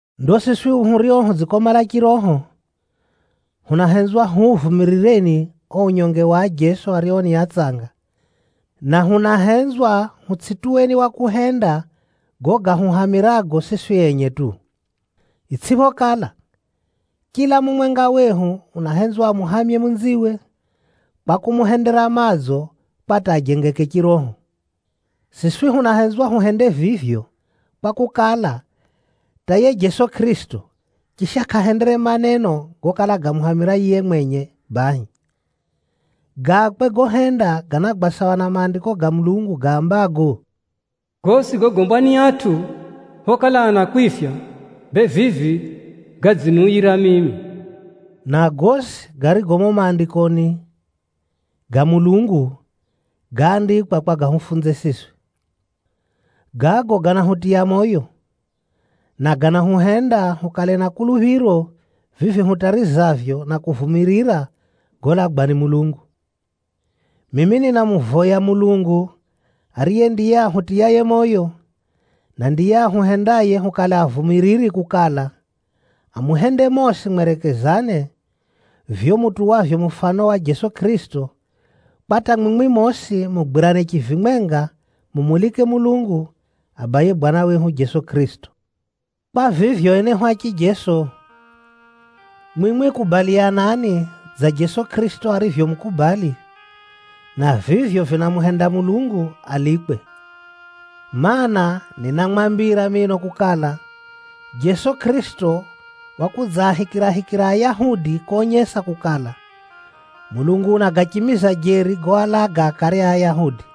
Ndo siswi hurio hudzikomala chiroho, hunahenzwa huuvumirireni o unyonge wa ajeso ario ni atsanga, na hunahenzwa hutsʼituweni wa kuhenda gago gahuhamirago siswi enye tu. Itsʼiphokala, chila mumwenga wehu unahenzwa amuhamye munziwe, kwa kumuhendera madzo kwa hata ajengeke chiroho. Siswi hunahenzwa huhende vivyo, kwakukala, hata yiye Jeso Kʼirisito, chisha kʼahendere maneno gokala gamuhamira yiye mwenye bahi. Gakwe gohenda ganagwa sawa na Maandiko ga Mulungu gaambago, “Gosi gogombwa ni atʼu phokala anakwifya, bee vivi gadziniuyira mimi.” Na gosi garigo mumo Maandikoni ga Mulungu gáandikwa kwa gahufunze siswi. Gago ganahutiya moyo, na ganahuhenda hukale na kuluphiro vivi hutarizavyo na kuvumirira golagwa ni Mulungu. Mimi ninamuvoya Mulungu ariye ndiye ahutiyaye moyo, na ndiye ahuhendaye hukale avumiriri kukala, amuhende mosi mwerekezane, vivyo mutuwavyo mufano wa Jeso Kʼirisito, kwa hata mwimwi mosi mugwirane chivimwenga mumulike Mulungu, Abaye Bwana wehu Jeso Kʼirisito. Kwa vivyo enehu a chijeso, mwimwi kubaliyanani dza Jeso Kʼirisito arivyomukubali, na vivyo vinamuhenda Mulungu alikwe. Maana, ninamwambira mino kukala, Jeso Kʼirisito wakudzaahikirahikira Ayahudi konyesa kukala, Mulungu unagachimiza jeri goalaga akare a Ayahudi.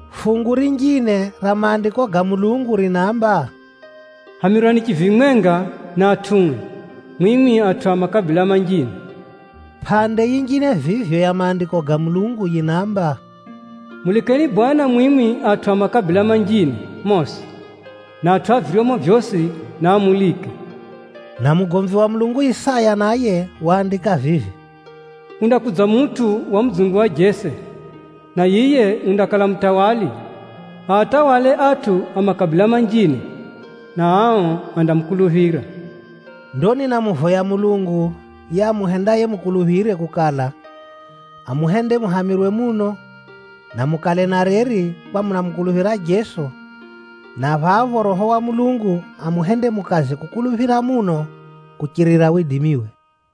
Fungu rinjine ra Maandiko ga Mulungu rinaamba, “Hamirwani chivimwenga na atʼue mwimwi atʼu a makabila manjine!” Pʼande yinjine vivyo ya Maandiko ga Mulungu yinaamba, “Mulikeni Bwana Mulungu mwimwi atʼu a mataifa gosi, na atʼu a viryomo vyosi, naamulike.” Na mugomvi wa Mulungu Isaya naye waandika vivi, “Kundakudza mutʼu wa mudzungu wa Jese, na yiye undakala mutawali, aatawale atʼu a makabila manjine, na ao andamukuluphira.” Ndo ninamuvoya Mulungu yiye amuhendaye mukuluphire kukala, amuhende muhamirwe muno, na mukale na reri kwa munamukuluphira Jeso, na phapho Roho wa Mulungu amuhende mukaze kukuluphira muno kuchirira widimiwe.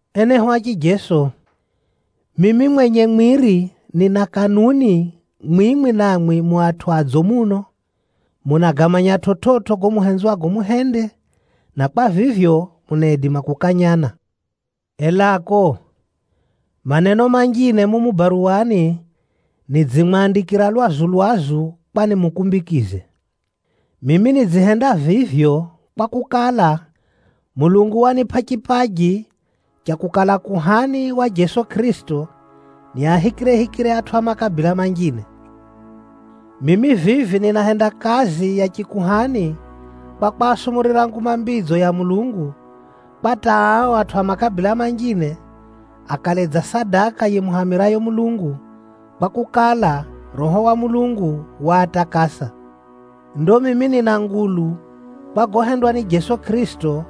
Enehu a chijeso, mimi mwenye mwiri nina kanuni mwimwi namwi mu atʼu adzo muno, munagamanya chividzo gago muhenzwago muhende, na kwa vivyo, munaidima kukanyana. Elako, maneno manjine mumu baruwani nidzimwandikira lwazu-lwazu kwa nimukumbikize. Mimi nidzihenda vivyo, kwakukala, Mulungu wanipʼa chipaji cha kukala kuhani wa Jeso Kʼirisito niahikirehikire atʼu a makabila manjine. Mimi vivi ninahenda kazi ya chikuhani kwa kwasumurira Nguma Mbidzo ya Mulungu, kwa hata ao atʼu a makabila manjine, akale dza sadaka yimuhamirayo Mulungu, kwakukala, Roho wa Mulungu waatakasa. Ndo mimi nina ngulu kwa gohendwa ni Jeso Kʼirisito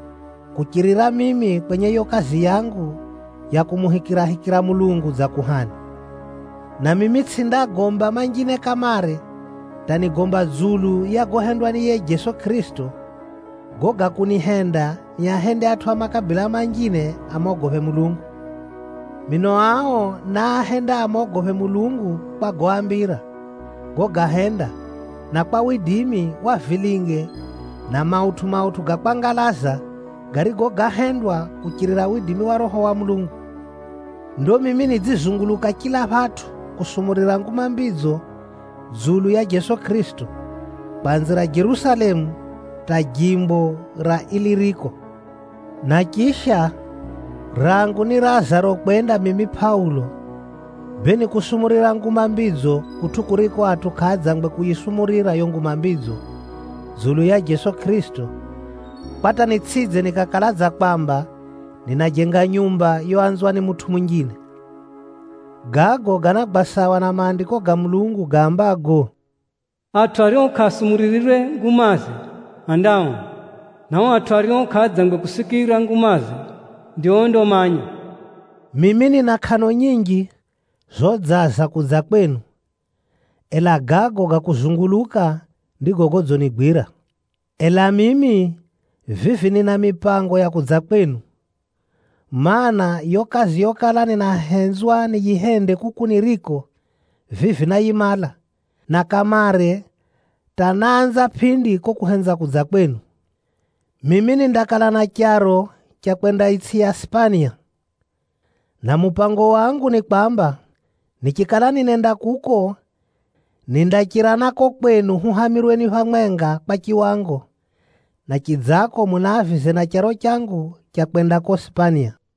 kuchirira mimi kwenye yo kazi yangu ya kumuhikirahikira Mulungu dza kuhani. Na mimi tsʼindagomba manjine kamare hata nigomba dzulu ya gohendwa ni yiye Jeso Kʼirisito, gago ga kunihenda niahende atʼu a makabila manjine amogophe Mulungu. Mino ao náahenda amogophe Mulungu kwa goambira, gogahenda, na kwa widimi wa vilinge na mautʼu-mautʼu ga kwangalaza, garigo gáhendwa kuchirira widimi wa Roho wa Mulungu. Ndo mimi nidzizunguluka chila phatʼu kusumurira Nguma Mbidzo dzulu ya Jeso Kʼirisito, kwanzira Jerusalemu hata jimbo ra Iliriko. Na chisha, rangu nirazaro kwenda mimi Pʼaulo, bee ni kusumurira Nguma Mbidzo kutʼu kuriko atʼu kʼaadzangwe kuyisumurirwa yo Nguma Mbidzo dzulu ya Jeso Kʼirisito, kwa hata nitsʼidze nikakala dza kwamba ninajenga nyumba yoanzwa ni mutʼu munjine. Gago ganagwa sawa na Maandiko ga Mulungu gaambago, “Atʼu ario kʼaasumuririrwe ngumaze, andaona, na o atʼu ario kʼaadzangwe kusikira ngumaze, ndio ondamanya.” Mimi nina kʼano nyinji zodzaza kudza kwenu, ela gago ga kuzunguluka ndigo godzinigwira. Ela mimi vivi nina mipango ya kudza kwenu, mana, yo kazi yokala ninahenzwa niyihende kuku niriko, vivi náyimala, na kamare hata náanza pʼindi ko kuhenza kudza ko kwenu. Mimi nindakala na charo cha kwenda itsʼi ya Sipania. Na mupango wangu ni kwamba, nichikala ninenda kuko, nindachira na ko kwenu huhamirweni phamwenga kwa chiwango, na chidzako muniavize na charo changu cha kwenda ko Sipania.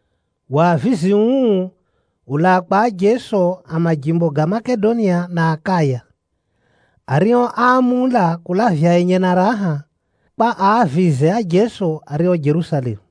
Wavizi uu ulaa kwa ajeso a majimbo ga Makedonia na Akaya, ario áamula kulavya enye na raha, kwa aavize ajeso ario Jerusalemu.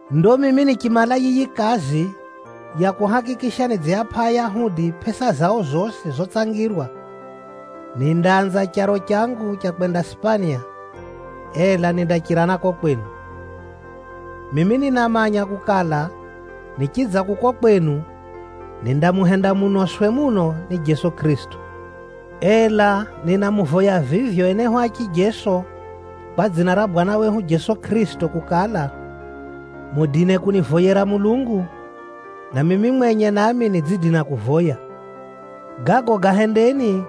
Ndo mimi nichimala yiyi kazi ya kuhakikisha nidziapʼa Ayahudi pʼesa zao zosi zotsangirwa, nindaanza charo changu cha kwenda Sipania, ela nindachira na ko kwenu. Mimi ninamanya kukala, nichidza kuko kwenu, nindamuhenda munoswe muno ni Jeso Kʼirisito. Ela ninamuvoya vivyo enehu a chijeso kwa dzina ra Bwana wehu Jeso Kʼirisito kukala, mudine kunivoyera Mulungu, na mimi mwenye nami nidzidina kuvoya. Gago gahendeni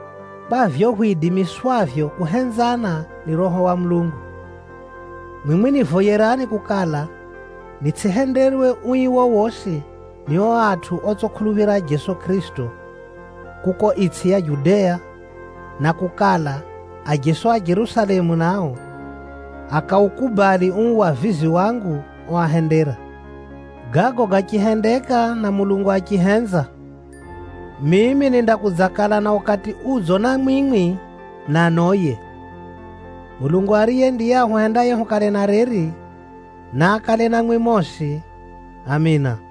kwa vivyo hwidimiswavyo kuhenzana ni Roho wa Mulungu. Mwimwi nivoyerani kukala, nitsʼihenderwe ui wowosi ni o atʼu otsʼikuluphira Jeso Kʼirisito kuko itsʼi ya Judea, na kukala, ajeso a Jerusalemu nao, akaukubali uu wavizi wangu oahendera. Gago gachihendeka na Mulungu achihenza, mimi nindakudzakala na ukati udzo na mwimwi, na noye. Mulungu ariye ndiye ahuhendaye hukale na reri, naakale namwi mosi! Amina.